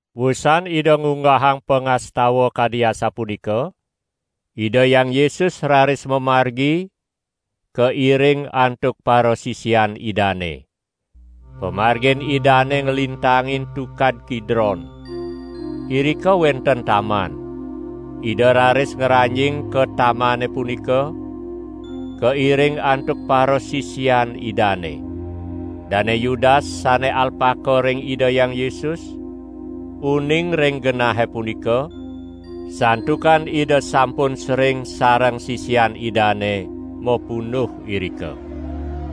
Wusan Ida ngunggahang pangastawan kadi asapunika, Ida Hyang Yesus raris mamargi kairing antuk parasisian Idane. Pamargin Idane nglintangin Tukad Kidron. Irika wenten taman. Ida raris ngranjing ka tamane punika, kairing antuk parasisian Idane. Dane Yudas sane alpaka ring Ida Hyang Yesus, uning ring genahe punika, santukan Ida sampun sering sareng sisian Idane mapunduh irika.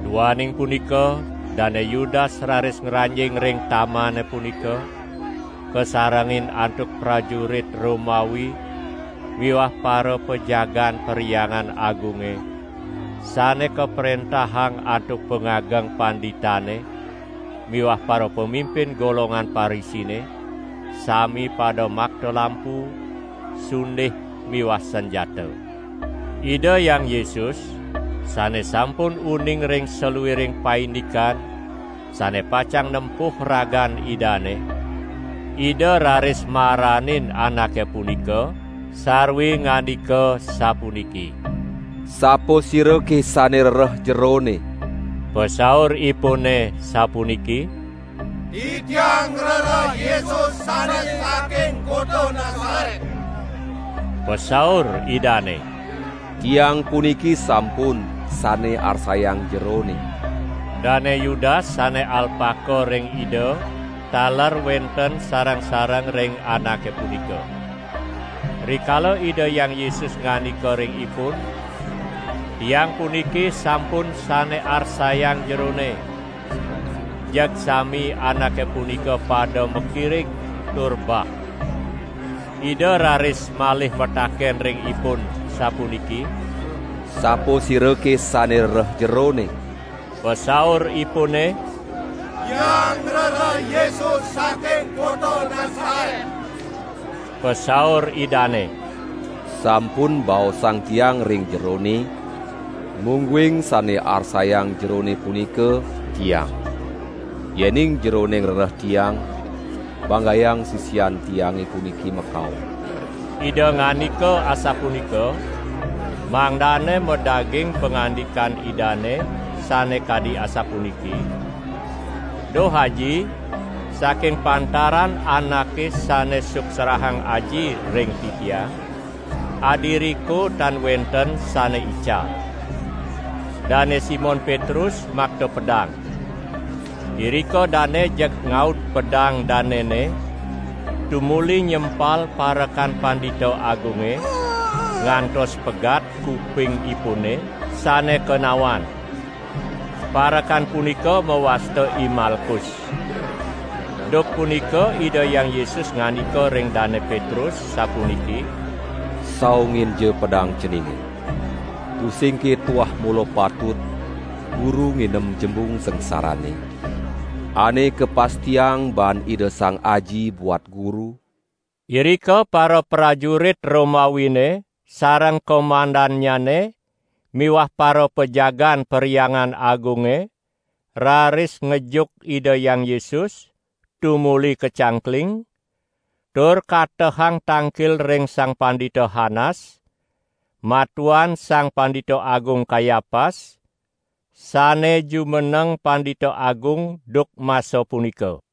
Duaning punika Dane Yudas raris ngranjing ring tamane punika, kasarengin antuk prajurit Romawi miwah parapajagaan Perhyangan Agunge sane kaprentahang antuk pangageng panditane miwah parapamimpin golongan Parisine, sami pada makta lampu, sundih miwah sanjata. Ida Hyang Yesus, sane sampun uning ring saluiring paindikan sane pacang nempuh ragan Idane, Ida raris maranin anake punika sarwi ngandika sapuniki: "Sapasirake sane rereh jerone?" Pasauripune sapuniki: "Titiang ngrereh Yesus sane saking kota Nasaret!" Pasaur Idane: "Tiang puniki sampun sane arsayang jerone!" Dane Yudas sane alpaka ring Ida taler wenten sareng-sareng ring anake punika. Rikala Ida Hyang Yesus ngandika ring ipun: "Tiang puniki sampun sane arsayang jerone", jeg sami anake punika pada makirig tur bah. Ida raris malih mataken ring ipun sapuniki: "Sapasirake sane rereh jerone?" Pasauripune: "Tiang ngrereh Yesus saking kota Nasaret!" Pasaur Idane: "Sampun baosang Tiang ring jerone, mungguing sane arsayang jerone punika Tiang! Yening jerone ngrereh Tiang, banggayang sisian Tiange puniki makaon!" ( Ida ngandika asapunika, mangdane madaging pangandikan Idane sane kadi asapuniki: "Duh Aji, saking pantaran anake sane suksrahang Aji ring Titiang, adiriko tan wenten sane ical.") Dane Simon Petrus makta pedang. Irika dane jeg ngaud pedang danene tumuli nyempal parekan Pandita Agunge, ngantos pegat kupingipune sane kenawan. Parekan punika mawasta I Malkus. Duk punika Ida Hyang Yesus ngandika ring Dane Petrus sapuniki: "Saunginja pedang ceninge! Tusingke tuah mula patut Guru nginem jembung sangsarane, ane kapastiang baan Ida Sang Aji buat Guru?" Irika paraprajurit Romawine sareng komandannyane miwah parapajagaan Perhyangan Agunge raris ngejuk Ida Hyang Yesus, tumuli kacangkling, tur katehang tangkil ring Sang Pandita Hanas, matuan Sang Pandita Agung Kayapas sane jumeneng Pandita Agung duk masa punika.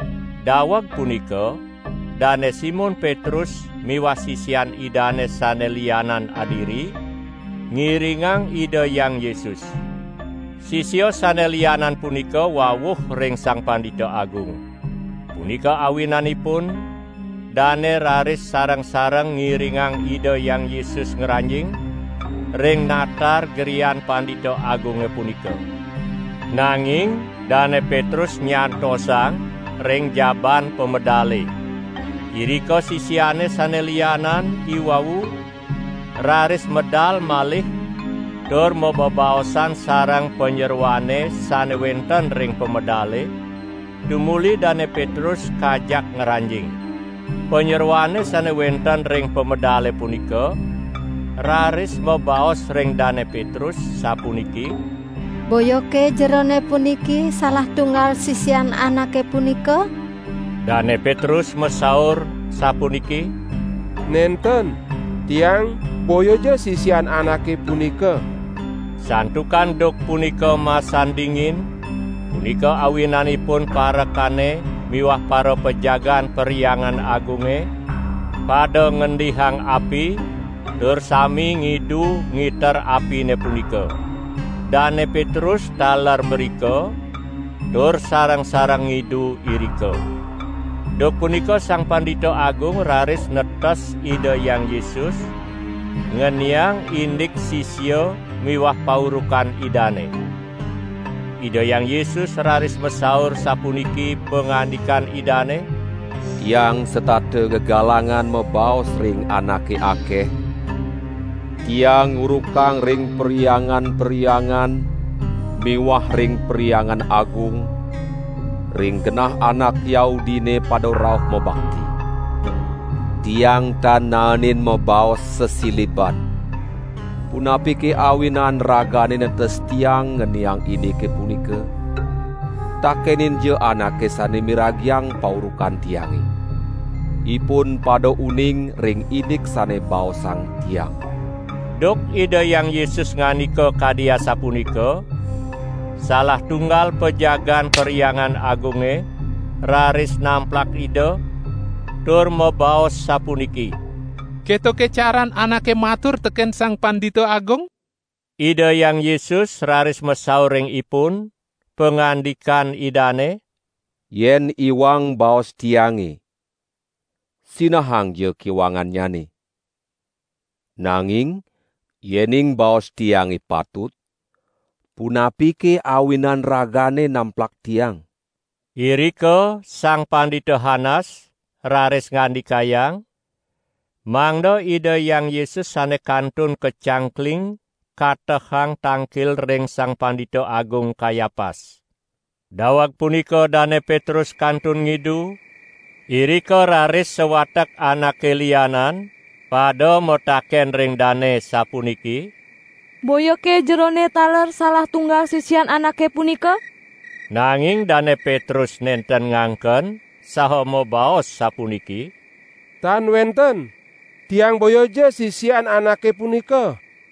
Daweg punika Dane Simon Petrus miwah sisian Idane sane lianan adiri, ngiringang Ida Hyang Yesus. Sisia sane lianan punika wawuh ring Sang Pandita Agung. Punika awinanipun dane raris sareng-sareng ngiringang Ida Hyang Yesus ngranjing, ring natar grian Pandita Agunge punika. Nanging Dane Petrus nyantosang ring jabaan pamedale. Irika sisiane sane lianan iwau raris medal malih tur mabebaosan sareng panyeroane sane wenten ring pamedale, tumuli Dane Petrus kajak ngranjing. Panyeroane sane wenten ring pamedale punika raris mabaos ring Dane Petrus sapuniki: "Boyake jerone puniki salah tunggal sisian Anake punika?" Dane Petrus masaur sapuniki: "Nenten, tiang boyaja sisian Anake punika!" Santukan duk punika masan dingin, punika awinanipun parekane miwah parapajagaan Perhyangan Agunge pada ngendihang api tur sami ngidu ngiter apine punika. Dane Petrus taler mrika tur sareng-sareng ngidu irika. Duk punika Sang Pandita Agung raris netes Ida Hyang Yesus ngeniang indik sisia miwah paurukan Idane. Ida Hyang Yesus raris masaur sapuniki pangandikan Idane: "Tiang setata gegalangan mabaos ring anake akeh; Tiang ngurukang ring perhyangan-perhyangan miwah ring Perhyangan Agung, ring genah anak Yahudine pada rauh mabakti. Tiang tan naenin mabaos sasiliban. Punapike awinan ragane netes Tiang ngeniang indike punika? Takeninja anake sane miragiang paurukan Tiange. Ipun pada uning ring indik sane baosang Tiang!" Duk Ida Hyang Yesus ngandika kadi asapunika, salah tunggal pajagaan Perhyangan Agunge raris namplak Ida, tur mabaos sapuniki: "Ketoke caran anake matur teken Sang Pandita Agung?" Ida Hyang Yesus raris masaur ring ipun, pangandikan Idane: "Yen iwang baos Tiange, sinahangja kiwangannyane! Nanging yening baos Tiange patut, punapike awinan ragane namplak Tiang?" Irika Sang Pandita Hanas raris ngandikayang, mangda Ida Hyang Yesus sane kantun kacangkling katehang tangkil ring Sang Pandita Agung Kayapas. Daweg punika Dane Petrus kantun ngidu; irika raris sawatek anake lianan pada mataken ring dane sapuniki: "Boyake jerone taler salah tunggal sisian Anake punika?" Nanging Dane Petrus nenten ngangken, saha mabaos sapuniki: "Tan wenten, tiang boyaja sisian Anake punika!"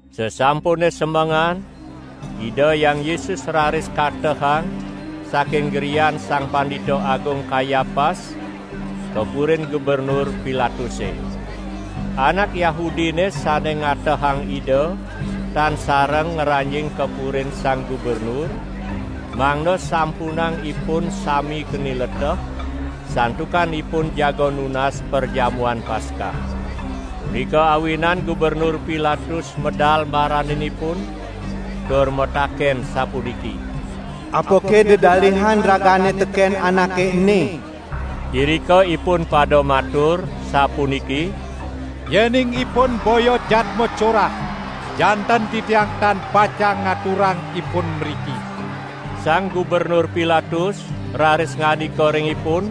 Sasampune semengan, Ida Hyang Yesus raris katehang saking grian Sang Pandita Agung Kayapas ka purin Gubernur Pilatuse. Anak Yahudine sane ngatehang Ida tan sareng ngranjing ka purin Sang Gubernur, mangda sampunang ipun sami keni leteh, santukan ipun jaga nunas Perjamuan Paskah. Punika awinan Gubernur Pilatus medal maranin ipun tur mataken sapuniki: "Apake dedalihan ragane teken Anake ene?" Irika ipun pada matur sapuniki: "Yening Ipun boya jadma corah, janten titiang tan pacang ngaturang Ipun mriki!" Sang Gubernur Pilatus raris ngandika ring ipun: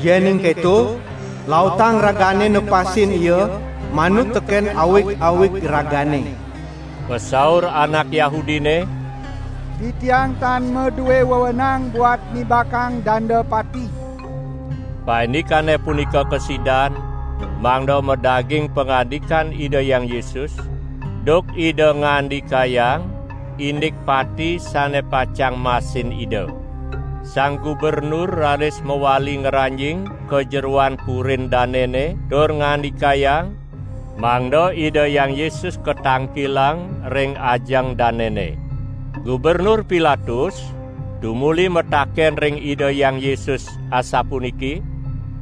"Yening keto, lautang ragane nepasin Ia manut teken awig-awig ragane!" Pasaur anak Yahudine: "Titiang tan madue wewenang buat nibakang danda pati!" ( Paindikane punika kasidan, mangda madaging pangandikan Ida Hyang Yesus, duk Ida ngandikayang indik pati sane pacang masin Ida.) Sang Gubernur raris mawali ngranjing ka jeroan purin danene tur ngandikayang, mangda Ida Hyang Yesus katangkilang ring ajeng danene. Gubernur Pilatus tumuli mataken ring Ida Hyang Yesus asapuniki: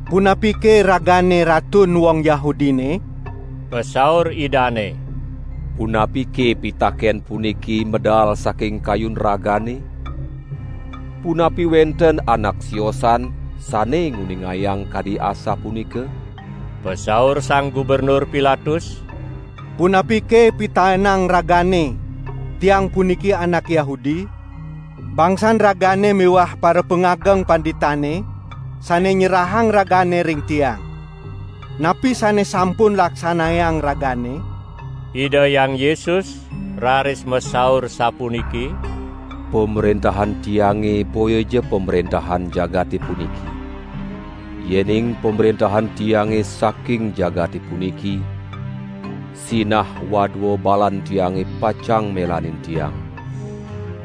"Punapike Ragane Ratun wong Yahudine?" Pasaur Idane: "Punapike pitaken puniki medal saking kayun ragane, punapi wenten anak siosan sane nguningayang kadi asapunika?" Pasaur Sang Gubernur Pilatus: "Punapike pitaenang Ragane tiang puniki anak Yahudi? Bangsan Ragane miwah parapangageng panditane sane nyerahang Ragane ring tiang. Napi sane sampun laksanayang Ragane?" Ida Hyang Yesus raris masaur sapuniki: "Pamrentahan Tiange boyaja pamrentahan jagate puniki; yening pamrentahan Tiange saking jagate puniki, sinah wadua balan Tiang pacang melanin Tiang,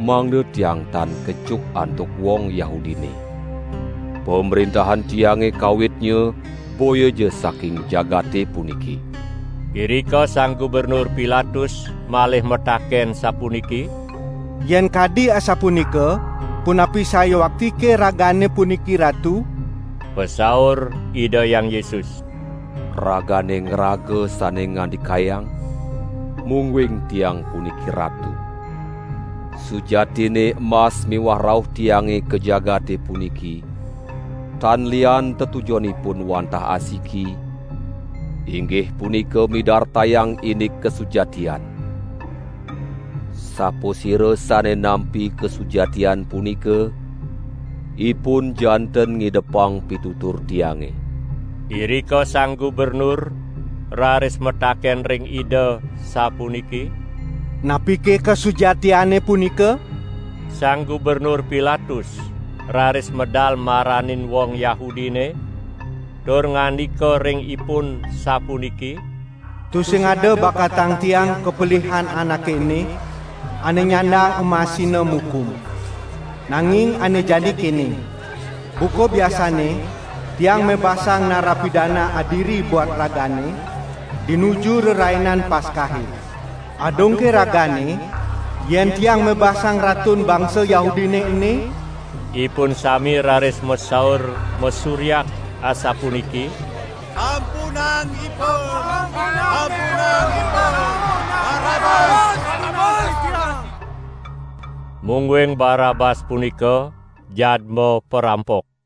mangda Tiang tan kejuk antuk wong Yahudine. Pamrentahan Tiange kawitnya boyaja saking jagate puniki!" Irika Sang Gubernur Pilatus malih mataken sapuniki: "Yen kadi asapunika punapi sayuaktike Ragane puniki Ratu?" Pasaur Ida Hyang Yesus: "Ragane ngraga sane ngandikayang mungguing Tiang puniki Ratu. Sujatinne embas miwah rauh Tiange ka jagate puniki tan lian tetujonipun wantah asiki: Inggih punika midartayang indik kasujatian. Sapasira sane nampi kasujatian punika ipun janten ngidepang pitutur Tiange!" Irika Sang Gubernur raris mataken ring Ida sapuniki: "Napike kasujatiane punika?" Sang Gubernur Pilatus raris medal maranin wong Yahudine tur ngandika ring ipun sapuniki: "Tusing ada bakatang tiang kapelihan Anake ene, ane nyandang emasina mukum! Nanging ane jani kene: Buka biasanne, tiang mebasang narapidana adiri buat ragane dinuju Rerainan Paskahe. Adungke ragane yen tiang mebasang Ratun bangsa Yahudine ene?" Ipun sami raris masaur masuryak asapuniki: "Sampunang Ipun, sampunang Ipun! Barabas tunas titiang!" (Mungguing Barabas punika jadma parampok.)